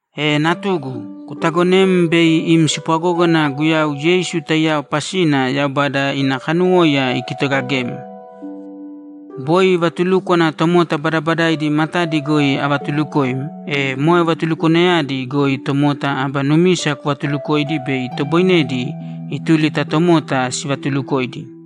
E natugu, kutaagonēm bei im spwagógana Guyau Yeisu taiyao pasina Yaubada ina kanuwóiya ikitogagem. Boi vatulúkwana tomota badabadaidi matadi goi avatuulukoim, e moe vatulukwanayadi goi tomota aba numisa kuvatuulukōidi bei itoboinedi ituli ta tomota sivatulukoidi.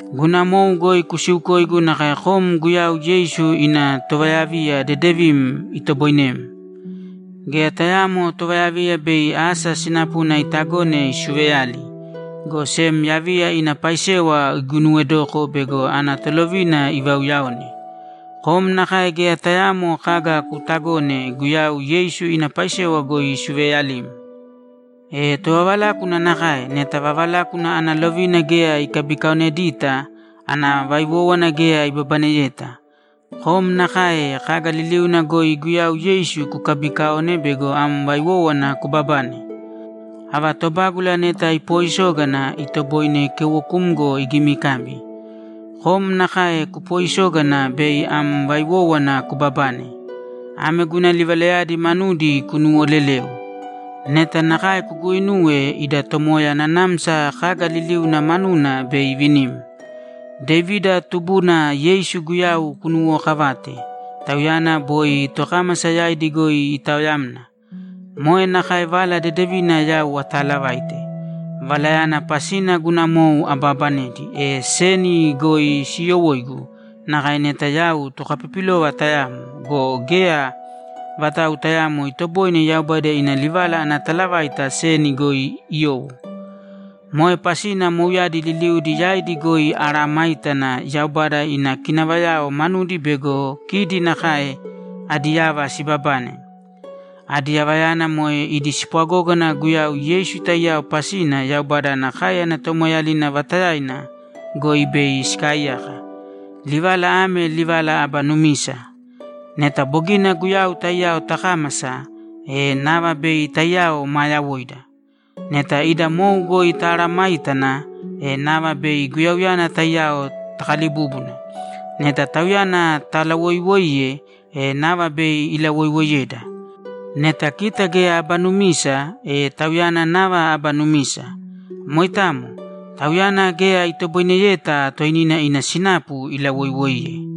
Guna mou goi kusiukōigu nakae kom Guyau Yeisu ina tovayaviya dedevim itoboinem. Geya tayaamo tovayaviya bei asa sinapuna itagone isuveyali, go sem yaviya ina paisewa iguinuwedoko bego ana tolovina ivauyaone. Kom nakae geya tayaamo kaga kuutagōne Guyau Yeisu ina paisewa goi isuveeyalim. E tovavalákuna nakae, neta vavalákuna ana lovina geya ikabikaonedita, ana vaiwówana geya ibabaneyeta. Kom nakae kaga liliuna goi Guyau Yeisu kukabiikaōne bego am vaiwówana kubabane. Ava tobágula neta ipoisógana, itoboine keuwokumgo igimikabi. Kom nakae kupoisōgana bei am vaiwówana kubabane. Ame guna livalayadi manudi kunuwolelēu. Neta nakae kuguuinuwe, ida Tomoya nanamsa kaga liliuna manuna bei ivinim. Devida tubuna Yeisu Guyau kunuwookavāte. Tauyana boi tokámasa yaidi goi itaoyamna. Moe nakae Vala Dedevina yau ataalavaite. Valayana pasina guna mou abaabanedi, e seni goi siyowóigu nakae neta yau tokapipilova tayamo go, geya vatau tayaamo itoboine Yaubada ina livala ana talavaita seni goi iyowo. Moe pasina mouyadi liliudi yaidi goi amesayágana Yaubada ina kinavayao manudi bego kidi nakae adi yava sibabane. Adi yavayana moe idi spwagógana Guyau Yeisu taiyao pasina Yaubada ana káeyana tomoeeyalina vata goi bei sikaaiyaka. Livala ame livala aba numisa: Neta bogina Guyau taiyao takámasa, e nava bei taiyao maa yawoida. Neta ida mou goi tamesayágana, e nava bei Guyauyana taiyao takalibúbuna. Neta Tauyana talawoiwoiye, e nava bei ilawoiwoiyeda. Neta kita geya aba numisa, e Tauyana nava aba numisa. Moitamo. Tauyana geya itoboineyeta toinina ina sinapu ilawoiwoiye.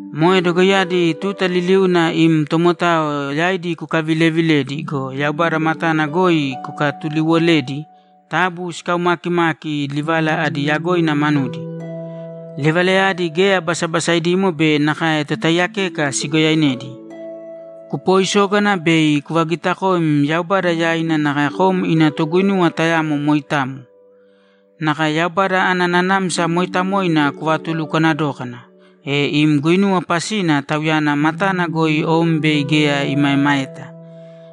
Moe dogoiyadi tuta liliuna im tomotao yaidi kukavilevilēdi go, Yaubada matana goi kukatuliiwolēdi taabu sikaumaakimāki livala adi yagoina manudi. Livalayadi geya basabasaidimo be nakae totaiyakeka sigoyainedi. Kupooisōgana bei kuvagitakōim Yaubada yaina nakae kom ina toguinuwa tayamo moitamo. Nakae Yaubada ana Nanamsa Mooitamoina kuvatulukwana dōkana, e im guinuwa pasina Tauyana matana goi om bei geya imaemaeta.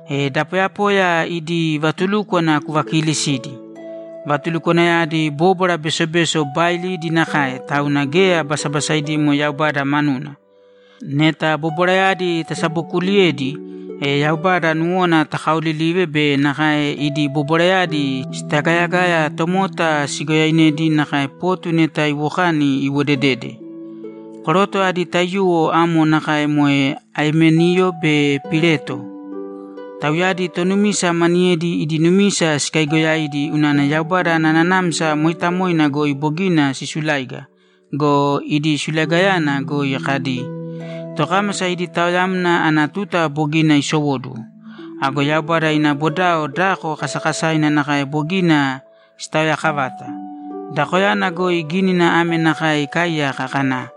E da poyapoya idi vatulúkwana kuvakiilisīdi. Vatulukwanayadi bobwara besobeso baailidi nakae, tauna geya basabasaidimo Yaubada manuna. Neta bobwarayadi tasabokuuliyedi, e Yaubada nuwona takaolilive be nakae idi bobwarayadi sitagayagaya tomota sigoyainedi nakae potu neta iwokani iwodedede. Koroto adi taiyuwo amo nakae moe Aimeniyo be Pileto. Tauyadi tonumisa maniyedi idi numisa sikaigoyaidi unana Yaubada ana Nanamsa Mooitamoina goi bogina sisuláiga go, idi sulaigayana goi kadi, ‘Tokámasa idi taoyamna ana tuta bogina isowóduwo.’ Ago Yaubada ina bodao dako kasakasaina nakae bogina sitaoyaakavata. Dakoyana goi gínina ame nakae ikaaiyaka kana,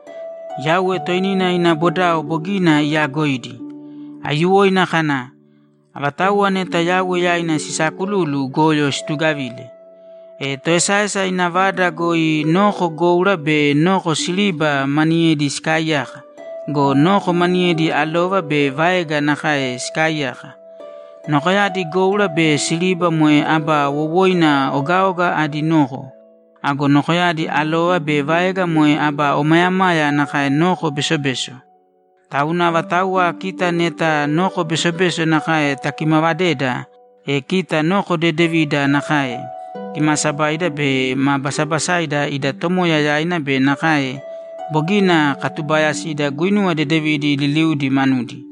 ‘Yauwe toinina ina bodao bogina iyaagoidi.’ Aiyuwoina kana, ‘Avatauwa neta Yauwe yaina sisaakululu goyo situgavīle.’ E toesaesa ina vada goi noko goura be noko siriba maniyedi sikaaiyaka go, noko maniyedi alova be vaega nakae sikaaiyaka. Nokoyadi goura be siriba moe aba wowoina ogaoga adi noko. Ago nokoyadi alova be vaega moe aba omayamaya nakae noko besobeso. Tauna avatauwa kita neta noko besobeso nakae takimaavadeda, e kita noko dedevida nakae, kimaasabaida be ma basabasaida ida Tomoya yaina be nakae bogina katubaayasida guinuwa dedevidi liliudi manudi.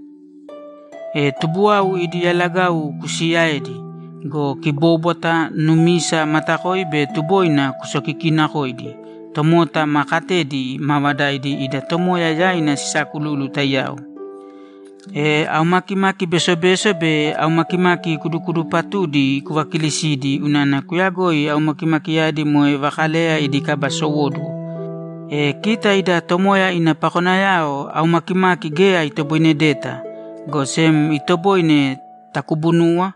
E tubuwau idi yalagau kusiiyaēdi go, kibóbwata, numisa, matakoi be tuboina kusokikiinakōidi tomota maa katedi maavadaidi ida Tomoya yaina sisaakululu taiyao. E aumakimaki besobeso be aumakimaki kudukudupatudi kuvakiilisīdi unana kuyagoi aumakimakiyadi moe vakaleya idi kaba sowóduwo. E kita ida Tomoya ina pakonayao aumakimaki geya itoboinedeta, go sem itoboine takubunuwa,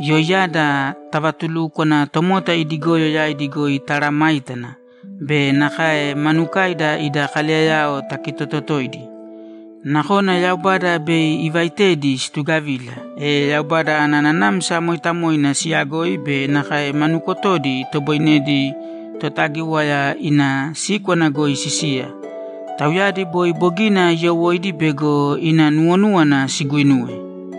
yoiyada tavatulúkwana, tomota idi goyo yaidi goi tamesayágana, be nakae manukaida ida kaleyayao takitototoidi. Nakona Yaubada bei ivaitedi situgavila, e Yaubada ana Nanamsa Mooitamoina siyagoi be nakae ma nukotodi itoboinedi Totagíwaya ina síkwana goi sisiya. Tauyadi boi bogina iyowóidi bego ina nuwonúwana siguuinuwe.